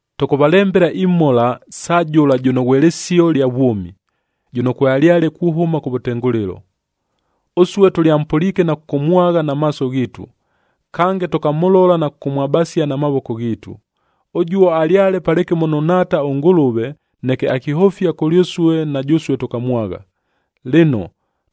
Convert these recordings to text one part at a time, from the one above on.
Tʉkʉvalembela imhola sa jʉla jʉno ghwe Lɨsio lya vwʉmi, jʉno kwealyale kuhʉma kʉvʉtengʉlɨlo.a Ʉsue tʉlyampʉliike na kʉkʉmwagha na maaso ghiitu, kange tʉkamʉlola na kʉkʉmwabasia na mavoko ghiitu. Ʉjuo alyale palɨkɨmo nʉ Nhaata ʉNgʉlʉve, neke akihʉfia kʉlyʉsue, na jʉsue tʉkamwagha. Lɨno,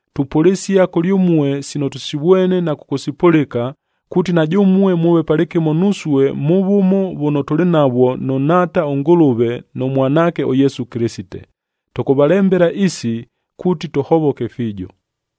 Tupʉlɨsia kʉlyʉmue sino tʉsivwene na kʉkʉsipʉlɨka, kuuti na jʉmue mʉʉve palɨkɨmo nusue mʉ vʉmo vʉno tʉlɨ navwo nʉ Nhaata ʉNgʉlʉve nʉ Mwanaakec ʉYesu Kɨlɨsite. Tʉkʉvalembela isi, kuuti tʉhovoke fiijo.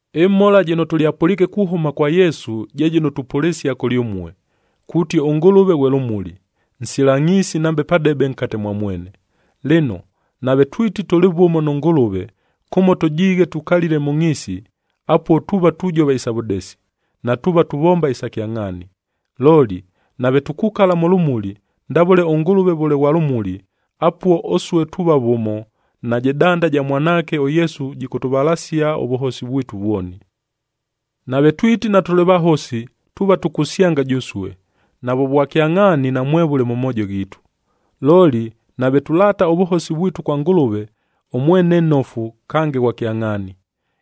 Ɨmhola jɨno tʉlyapʉliike kuhʉma kwa Yesu, je jɨno tupʉlɨsia kʉlyʉmue, kuuti ʉNgʉlʉve ghwe lʉmuli, nsila ngʼhiisi nambe padebe nkate mwa mwene. Lɨno, nave twiti tʉlɨ vʉmo nʉ Ngʉlʉve, kʉmo tʉjiighe tukalile mʉ ngʼhiisi, apuo tuuva tujova isa vʉdesi, natuuva tuvomba isa kyangʼhaani. Looli, nave tukukala mʉ lʉmuli, ndavʉle ʉNgʉlʉve vʉle ghwa lʉmuli, apuo ʉsue tuuva vʉmo, najɨ danda ja Mwanaake ʉYesu jɨkʉtʉvalasia ʉvʉhosi vwitu vwoni. Nave twiti natʉlɨ vahosi, tuuva tukusyanga jʉsue, navʉ vwakyangʼhaani namwevʉle mʉ moojo ghiitu. Looli, nave tulaata ʉvʉhosi vwitu kwa Ngʉlʉve, ʉmwene nnofu kange ghwa kyangʼhaani,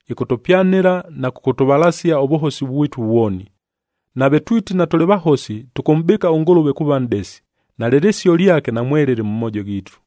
ɨkʉtʉpyanɨla na kʉkʉtʉvalasia ʉvʉhosi vwitu vwoni. Nave twiti natʉlɨ vahosi, tʉkʉmʼbɨɨka ʉNgʉlʉve kuuva nʼdesi, nalɨ lɨsio lyake namwelɨlɨ mʉ moojo ghiitu.